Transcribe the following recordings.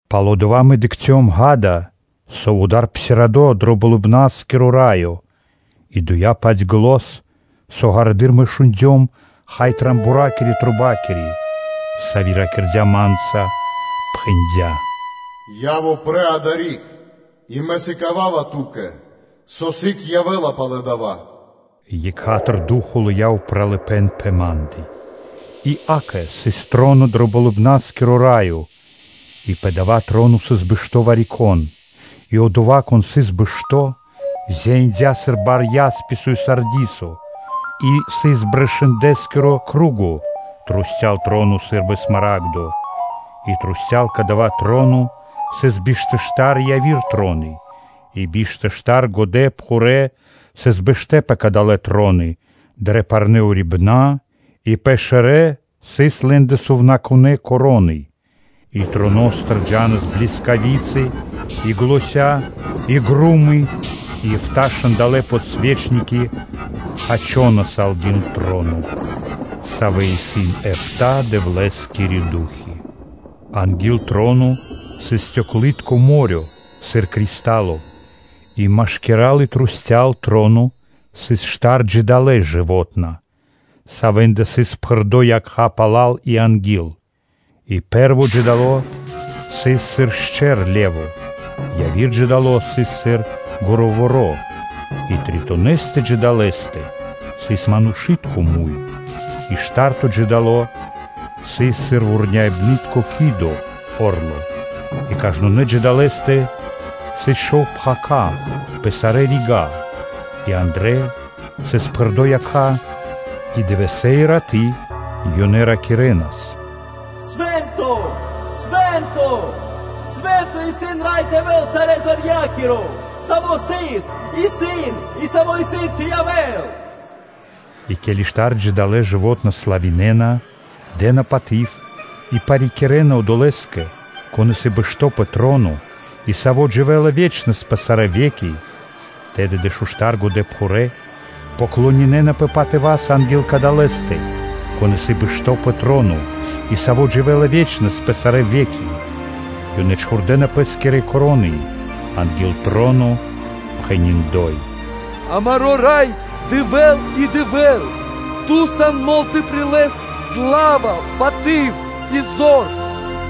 Пало́ (после) дава́ мэ дыкхцём, – ґа́да, со вуда́р исын псирадо (отпхандло) дро Болыбна́скиро Раё. И доя́-паць зан, со ґарэдыр мэ шундём, хай, рогоскири (трубакири), сави́ ракирдя́ ма́нца, пхэндя́: “Яв упрэ́ адари́к, и Мэ сыкава́ва ту́кэ, со сыг явэ́ла пало́ дава́. Екха́тыр Ду́хо (Фа́но) лыя́ упралыпэ́н пэ ма́ндэ. И, акэ, сыс троно дро Болыбна́скиро Раё, и пэ дава́ троно сыс бэшто́ Вари-Кон. И Одова́, Кон сыс бэшто́, зяиндя сыр бар ясписо и сардисо, и сыс брышындэскири банги (радуга) трусця́л троно сы́рбы смарагдо. И трусця́л кадава́ троно сыс биш тэ штар яви́р троны и биш тэ штар годэпхурэ́ сыс бэштэ́ пэ кадалэ́ троны дрэ парнэ́ урибэна́ и пэ шэрэ́ сыс лэ́ндэ сувнакунэ́ вянки (короны). И троностыр джа́нас блискави́цы, и заня́, и гро́мы и эфта́ шандалэ (подсвечники) хачонас анги́л троно, савэ́ исын эфта́ Дэвлэ́скирэ ду́хи. Анги́л троно сыс стёклы́тко (балунало́) мо́рё (дэрья́в) сыр кристало, и машкира́л и трусця́л троно сыс штар джидалэ (жывотна), савэ́ндэ сыс пхэрдо́ якха́ пала́л и анги́л; и пэ́рво джидало сыс сыр шчэр (ле́во), яви́р джидало сыс сыр гуруворо, и тритонэстэ джидалэстэ сыс манушы́тко муй, и шта́рто джидало сыс сыр вурняибнытко о́рло (ки́до). И кажнонэ́ джидалэстэ сыс шов пхака́ (крылы) пэ сарэ́ рига́, и андрэ́ сыс пхэрдо́ якха́ и дывэсэ́ и раты́ ёнэ ракирэ́нас: “Свэ́нто, Свэ́нто, Свэ́нто исын Рай Дэвэ́л, Сарэзорья́киро, Саво́ сыс исын, и Саво́ трэй исын тэ явэ́л.” И ке́ли штар джидалэ (жывотна) славинэна, дэ́на паты́в и парикирэна Одолэ́скэ, Кон исын бэшто́ пэ троно и Саво́ дживэ́ла ве́чнэс пэ сарэ́ ве́ки, тэды дэшуштар годэпхурэ́ клонинэнапэ патыва́са анги́л Кадалэстэ, Кон исын бэшто́ пэ троно, и Саво́ дживэ́ла ве́чнэс пэ сарэ́ ве́ки. Ёнэ чхурдэна пэ́скирэ вянки (короны) анги́л троно, пхэни́: “Амаро́ Рай Дэвэ́л и Дэвэ́л! Ту сан мол тэ прилэс сла́ва, паты́в и зор,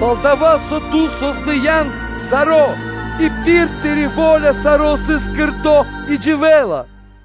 пал-дова́ со Ту создыян саро́ и пир Тыри́ во́ля саро́ сыс создыно́ и дживэ́ла.”